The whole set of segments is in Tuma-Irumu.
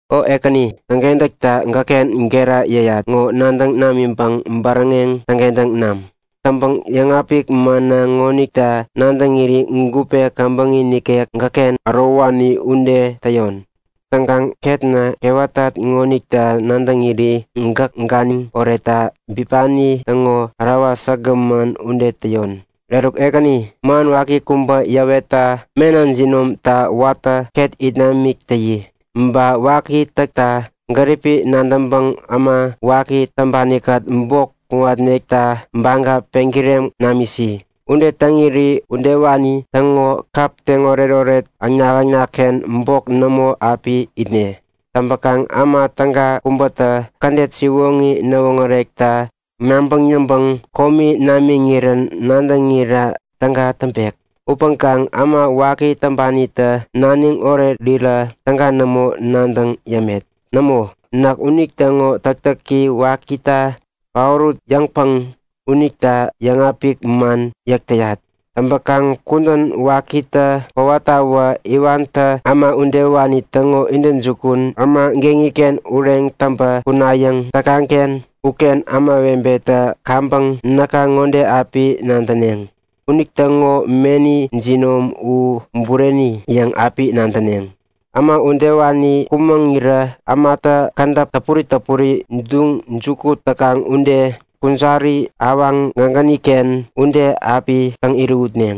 O Ekäni, täŋkentäkta gäkken gera yäyat ŋo nadäŋ namiŋpäŋ bäräŋeŋ täŋkentäŋ nam. Täŋpäŋ yäŋapik manna ŋonita nadäŋiri gupe käbäŋi nikek gäkken ärowani ude täyon. Täŋkaŋ ketna kewatat ŋonita nadäŋiri gäk ganiŋ oretta bipani täŋo ärawa säkgämän ude täyon. Eruk Ekäni, man waki kubä yäwetta mena jinomta watä ket it namik täyi. Ba waki täkta gäripi nadäŋpäŋ äma waki täŋpanikät bok kuŋatneta baga peŋkireŋ namisi. Ude täŋiri udewani täŋo kap teŋ oretoret äŋnak-äŋnakken bok nämo api itne. Täŋpäkaŋ äma täga kubätä kädet siwoŋi näwoŋärekta nabäŋ yäŋpäŋ komi namiŋirän nadäŋira täga täŋpek. Upäŋkaŋ äma waki täŋpanitä naniŋ orerirä täga nämo nadäŋ yämet. Nämo, näk unitäŋo täktäki wakitä paorut yäŋpäŋ unita yäŋapik man yäk täyat. Täŋpäkaŋ kudän wakita kowatawä iwantä äma udewani täŋo intäjukun äma geŋiken ureŋ täŋpä kunayäŋ täkaŋken uken ämawebetä kaŋpäŋ näka ŋode api nadäneŋ; Unitäŋo meni jinom u bureni yäŋ api nadäneŋ. Äma udewani kumäŋirä ämatä kädäp täpuri täpuri duŋ-jukut täkaŋ ude kujari awaŋ gägäniken ude api täŋirähutneŋ.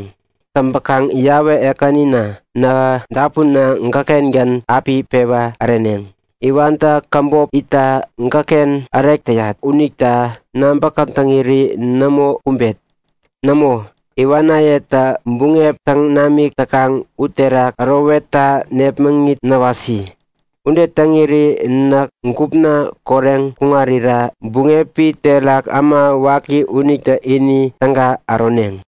Täŋpäkaŋ Yawe Ekänina, nähä dapunna gäkkengän api pewa äreneŋ. Iwanta käbop itta gäkken ärek täyat unita nabä-kätäŋiri nämo kumbet. Nämo, iwanayetä buŋep täŋ namik täkaŋ uterak ärowetta nepmäŋit näwasi. Ude täŋiri näk gupna koreŋ kuŋarira buŋepi terak äma waki unitä ini täga äroneŋ.